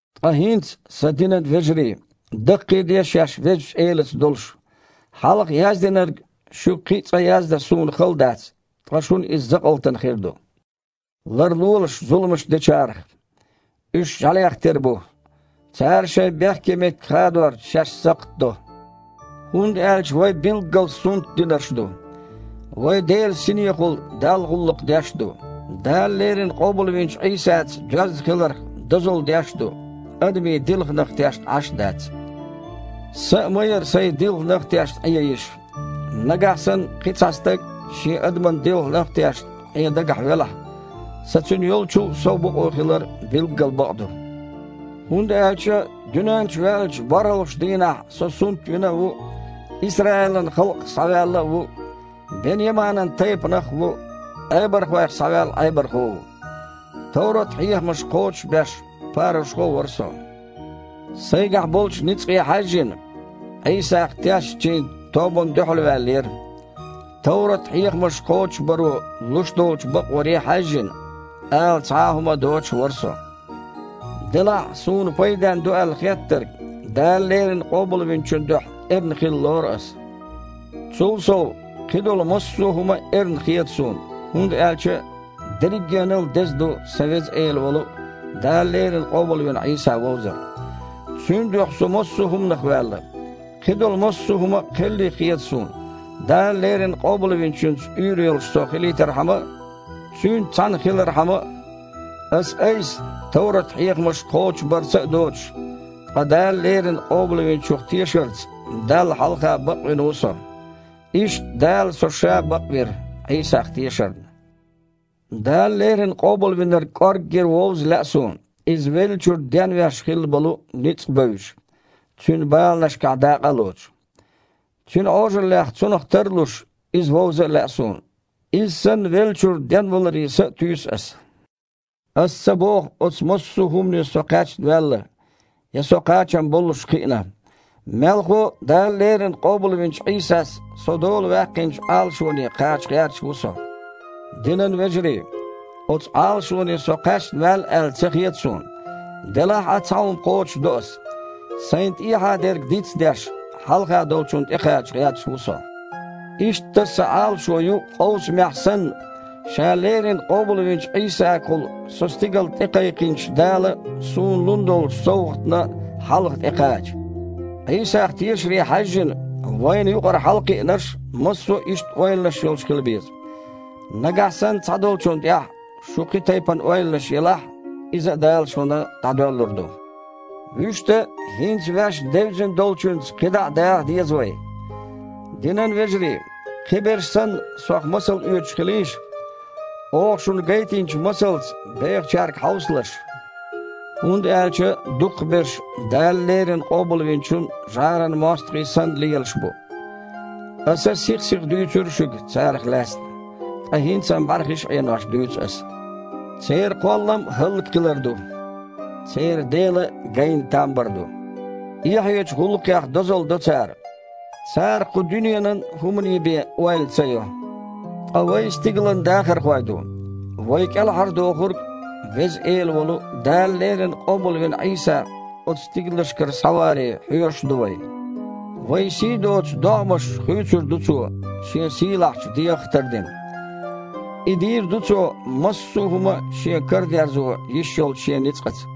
Ткъа хІинца, сан динан вежарий, даккхийде шаьш Везачу Элаца долуш. Хьалха яздинарг шуьга кхин а цкъа яздан суна хала дац, ткъа шуна иза закъалтана хир ду. Ларлолаш зуламаш дечарах! Уьш жІаьлех тера бу, цара шайн бехке меттиг хадорца шаьш сакхт до! ХІунда аьлча вай билггал сунтдинарш ду. Вай Делан Синехула Далла гІуллакх деш а ду, Дала леррина къобалвинчу Іийсаца доьзна хиларх дозалла деш а ду, адамийн дилханах тешна Іаш а дац. Сан а ма яра, сайн дилханах а тешна, Іен йиш. Нагахь санна кхин цхьа стаг, шен адаман дилханах а тешна, Іен дагахь велахь, сан цуьнан йолчул а сов бакъо хилар билггал бакъду. ХІунда аьлча дуьнен чу ваьллачу борхІалгІачу дийнахь со сунтвина а ву, Исраилан халкъах схьаваьлла а ву, Бен-Яманан тайпанах а ву, Іебархойх схьаваьлла Іебархо а ву. Товрат-хьехамаш кхочушбеш парушхо а вара со. Сайгахь болчу ницкъе хьаьжжина, Іийсах тешначийн тобанна дуьхьалваьллера. Товрат-хьехамаш кхочушбаро луш долчу бакъвар э хьаьжжина, ала цхьа а хІума доцуш вара со. Делахь а суна пайденна ду аьлла хеттарг Дала леррина Къобалвинчун дуьхьа эрна хилла лору аса. Цул сов, кхидолу массо а хІума эрна хета суна, хІунда аьлча дерригенал а деза ду сан Веза Эла волу, Дала леррина къобалвина Іийса вовзар. Цуьнан дуьхьа со массо а хІуманах ваьлла. Кхидолу массо а хІума кхелли хета суна, Дала леррина Къобалвинчуьнца уьйр йолуш со хилийтархьама а, Цуьнца цхьаьна хилархьама а. Ас-айса, товрат-хьехамаш кхочушбарца а доцуш, ткъа Дала леррина Къобалвинчух тешарца Далла хьалха бакъвина ву со. Иштта Дала Ша со бакъвира, Іийсах тешарна. Дала леррина Къобалвинарг кІоргге вовза лаьа суна, Иза веллачуьра денвеш хилла болу ницкъ а бевзаш, Цуьнан баланашкахь дакъа а лоцуш. Цуьнан Іожаллехь Цунах тар а луш, Иза вовза а лаьа суна, Иза санна, веллачуьра денваларе са а туьйсу аса. Аса ца боху, оцу массо а хІумане со кхаьчна ваьлла, я со кхачам боллуш кхиъна. Мелхо а, Дала леррина къобалвинчу Іийсас со дола ваьккхинчу Іалашоне кхача гІерташ ву со. Динан вежарий! Оцу Іалашоне со кхаьчна ваьлла аьлла ца хета суна. Делахь а цхьа хІума кхочушдо ас: сайна тІехьа дерг диц а деш, хьалха долчунна тІекхача гІерташ ву со. Иштта, сан Іалашо ю, къовсамехь санна, Ша леррина къобалвинчу Іийсагахула со стигала тІекхайкхинчу Дала суна лун долчу совгІатна хьалха тІекхача. Іийсах тешаре хьаьжжина, вайна юкъара хьалакхиънарш массо а иштта ойланаш йолуш хила беза. Нагахь санна цхьадолчунна тІехь шун кхин тайпана ойланаш елахь а, иза а Дала шуна дІадоьллур ду. Вуьшта, хІинца ваьшна девзина долчуьнца кхидІа а даха деза вай. Динан вежарий! Кхиберш санна, сох масал оьцуш хилийша. Оха шуна гайтинчу масалца бехачаьрга хьовсалаш. ХІунда аьлча дукхахберш Дала леррина Къобалвинчун жІаран мостагІий санна лелаш бу. Аса сих-сиха дуьйцура шуьга царах лаьцна, ткъа хІинца-м, бІаьрхиш а Іенош, дуьйцу аса. Церан кхоллам – хІаллакьхилар ду. Церан дела – гайна там бар ду. Эхьечу гІуллакхех дозалла до цара. Цара, кху дуьненан хІуманийн бен, ойла ца йо. Ткъа вай стигалан дахархой ду. Вай КІелхьардохург, Веза Эла волу, Дала леррина къобалвина Іийса, оцу стигалшкара схьаваре хьоьжуш а ду вай. Вайн сий доцу догІмаш хуьйцур ду Цо, Шен сийлахьчу дегІах а тардина. И дийр ду Цо массо а хІума а Шен карадерзо йиш йолчу Шен ницкъаца.